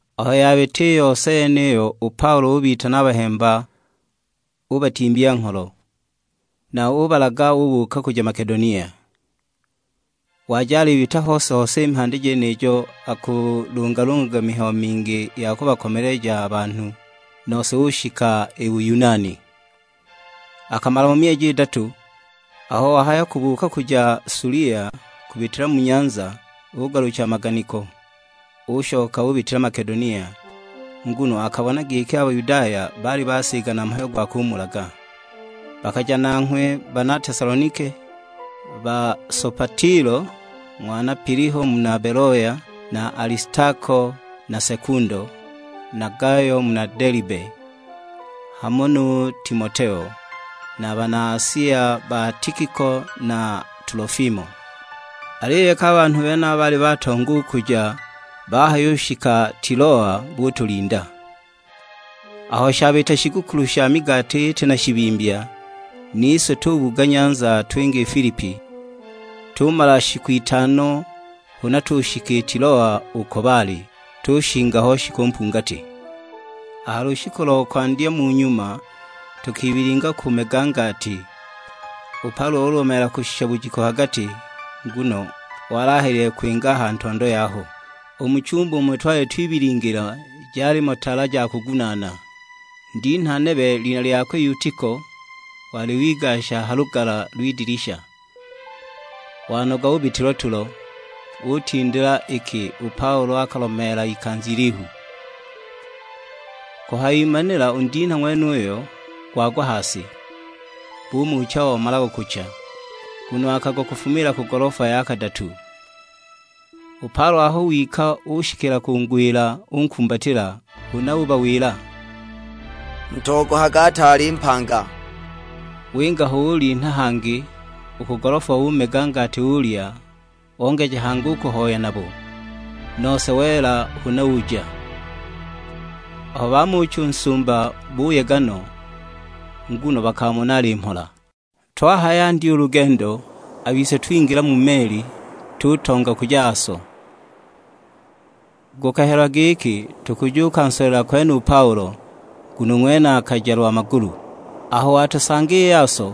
Aho yabita i yose yeniyo u Paulo ubitana a bahemba ubatimbya ngholo, na ubalaga ubuuka kuja Makedonia. Waja alibita hose-hose i mhandi jenijo akulungalungaga mihayo mingi ya kubakomeleja a banhu, nose ushika i Buyunani. Akamala mo myeji idatu; aho wahaya kubuuka kuja Sulia kubitila mu nyanza, ugalucha a maganiko; ushoka ubitila Makedonia, nguno akabona giki a Bayudaya baali basigana mhayo gwa kumulaga. Bakaja nanghwe bana Tesalonike, ba Sopatilo ng'wana Piliho muna Beloya na Alistako na Sekundo, na Gayo muna Delibe, hamo nu Timoteo; na bana Asia ba Tikiko na Tulofimo. Aliyo iki a banhu benaba baali batonga u kuja, bahayushika Tiloa butulinda. Aho shabita shigukulu sha migati iti na shibimbya, nise tubuga nyanza twinga i Filipi, tumala shiku itano huna tushika i Tiloa uko baali; tushinga ho shiku mpungati. A ha lushiku lo kwandya mu nyuma tukibilinga kumega ngati, u Paulo ulomeela kushisha bujiku ha gati, nguno wali ahelile kwinga a ha ntondo yaho. U mu chumba umo twali twibilingila jalimo tala ja kugunaana. Ndinha nebe, lina lyakwe Yutiko, wali wigasha ha lugala lw'idilisha, wanoga ubitwa tulo, utindila iki u Paulo akalomeela ikanza ilihu. Kuhayimanila u ndinha ng'wenuyo wagwa ha si; bumucha omalaga gucha, nguno akagwa kufuma ku golofa ya kadatu. U Paulo aho wika ushikila kungwila unkumbatila; huna ubawila, "Mutogohage ataali mpanga!" Winga ho ulinha hangi u ku golofa, umega ngati ulya, ongeja hangi u kuhoya nabo; nose wela huna uja. Aho bamucha u nsumba buyega no, nguno bakamona ali mhola. Twahayandya u lugendo, a bise twingila mu meli tutonga kuja Aso, gukahelwa giki tukujunsolela kwene u Paulo; nguno u ng'wene akaja lwa magulu. Aho watusanga i Aso,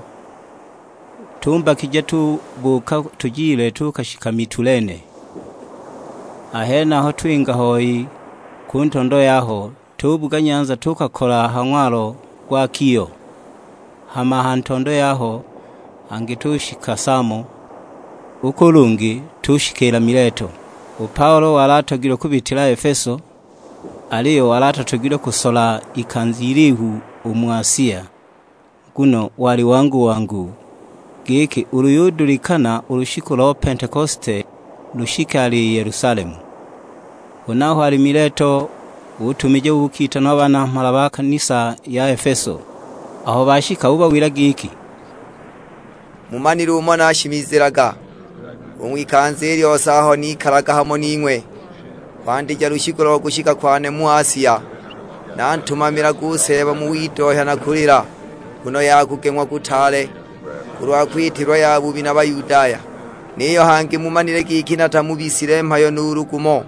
tumbakija tubuuka tujile tuukashika Mitulene. A henaho twinga hoi ku ntondo yaho, tubuga nyanza tuukakola ha ng'walo gwa Kio; hama a ha ntondo yaho hangi tushika Samo, u ku lungi tushikiila Mileto. U Paulo wali atogilwe kubitila Efeso; aliyo wali atatogilwe kusola ikanza ilihu u mu Asia, nguno wali wangu-wangu; giki ulu yudulikana u lushiku lo Pentekosite lushike ali Yelusalemu. Huna aho ali Mileto utumija bukitanwa a banamhala ba kanisa ya Efeso. Aho bashika ubawila giki, "Mumanile umo nashimizilaga u ng'wikanza i lyose aho nikalaga hamo ning'we, kwandija lushiku lo kushika kwane mu Asia. Nantumamilaga u Seeba mu widohya na kulila, nguno ya kugeng'wa kutaale, kulwa kwitilwa yabubi na Bayudaya. Niyo hangi mumanile giki natamubisile mhayo nuulu gumo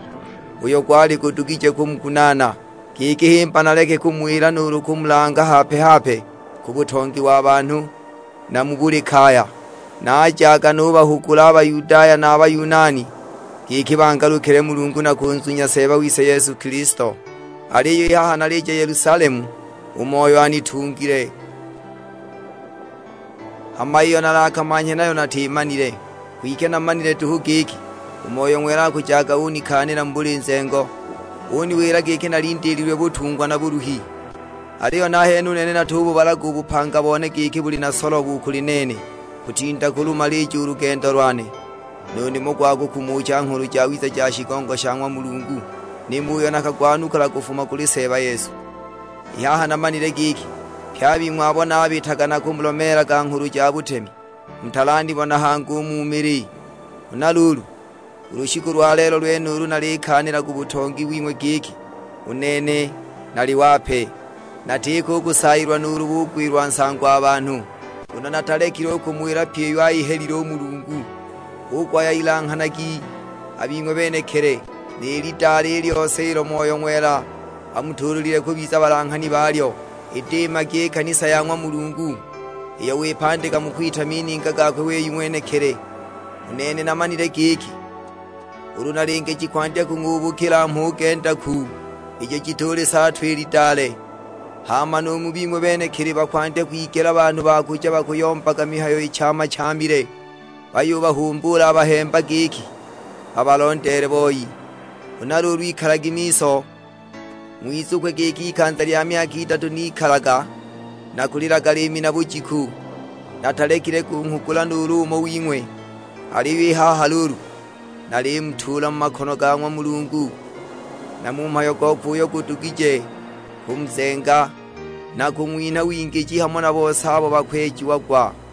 uyo gwali gudugije kumugunaana, giki himba naleke kumuwila nuulu kumulanga hape-hape ku butongi wa banhu, na mu buli kaya. Najaga nubahugula a Bayudaya na a Bayunani, giki bangalukile Mulungu na kunzunya Seeba wise Yesu Kilisto. Aliyo i haha nalija Yelusalemu, u Moyo anitungile; hama iyo nalakamanhye nayo natimanile. Kwike namanile duhu giki, u Moyo Ng'wela akujaga unikaanila mu buli nzengo, uniwila giki nalindiililwe butungwa na buluhi. Aliyo nahene u nene natububalaga u bupanga bone giki buli na solobo u kuli nene, kutinda kulumalija u lugendo lwane, nu nimo gwa kukumucha Nghulu Jawiza ja shigongo sha ng'wa Mulungu, nimo uyo nakagwanukula kufuma kuli Seeba Yesu. "I haha namanile giki, pye a bing'we abo nabitaga nakumulomeelaga nghulu ja butemi, mutalanibona hangi u mu mili. Huna luulu, u lushiku lwa lelo lwenulu nalikaanila ku butongi wing'we giki, u nene nali wape. Natiko u kusayilwa nuulu bugwilwa nsago a banhu nuulu: neelaga u mu mininga.'. Nguno natalekile u kumuwila pyi iyo ayihelile u Mulungu. Hu kuhaya ilanghanagi a bing'we benekili, ni lidale i lyose ilo Moyo Ng'wela amutuulile kubiza balanghani balyo; idiimagi i kanisa ya ng'wa Mulungu, iyo wipandika mu kwita mininga gakwe wei ng'wenekili. U nene namanile giki, ulu nalinge jikwandya kung'ubukila mhuge ndaku, ijo jitulisaatwa i lidale. Hama nu mu bing'we benekili bakwandya kwigela banhu ba kuja bakuyombaga mihayo ichaama-chaamile, bayubahumbuula a bahemba giki babalondeele boi. Huna luulu ikalagi miso, ng'wizukwe giki ikanza lya myaka idatu nikalaga nakulilaga liimi na bujiku, natalekile kunghugula nuulu umo wing'we. Aliyo i haha luulu, nalimutuula mu makono ga ng'wa Mulungu, na mu mhayo gokwe uyo gudugije kumuzenga, na kung'winha wingiji hamo na bose abo bakwejiagwa.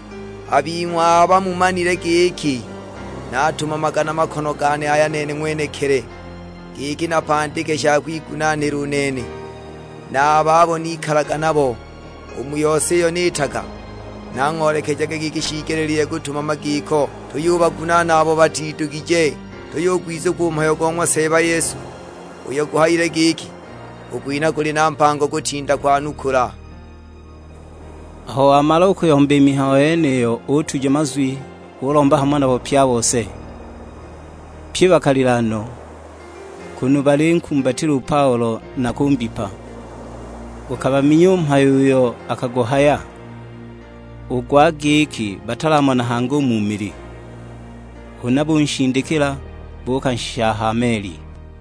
A bing'we aba mumanile giki naatumamaga na makono gane aya nene ng'wenekili, giki napandike sha kwigunaanila u nene, na a babo nikalaga nabo. U mu yose iyo niitaga, nang'oolekejaga giki shiigelile kutumama giko, tuyubagunaana abo batidugije; tuyugwizukwa u mhayo go ng'wa Seeba Yesu; uyo guhayile giki, 'U kwinha kuli na mbango kutinda kwanukula.' " Aho wamala u kuyomba i yeniyo utuja mazwi, ulomba hamo nabo pye a bose. Pye bakalila no, kunu balinkumbatila u Paulo, na kumbipa. Gukabaminya u mhayo uyo akaguhaya, u gwa giki batalamona hangi u mu mili. Huna bunshindikila, buukanshisha a ha meli.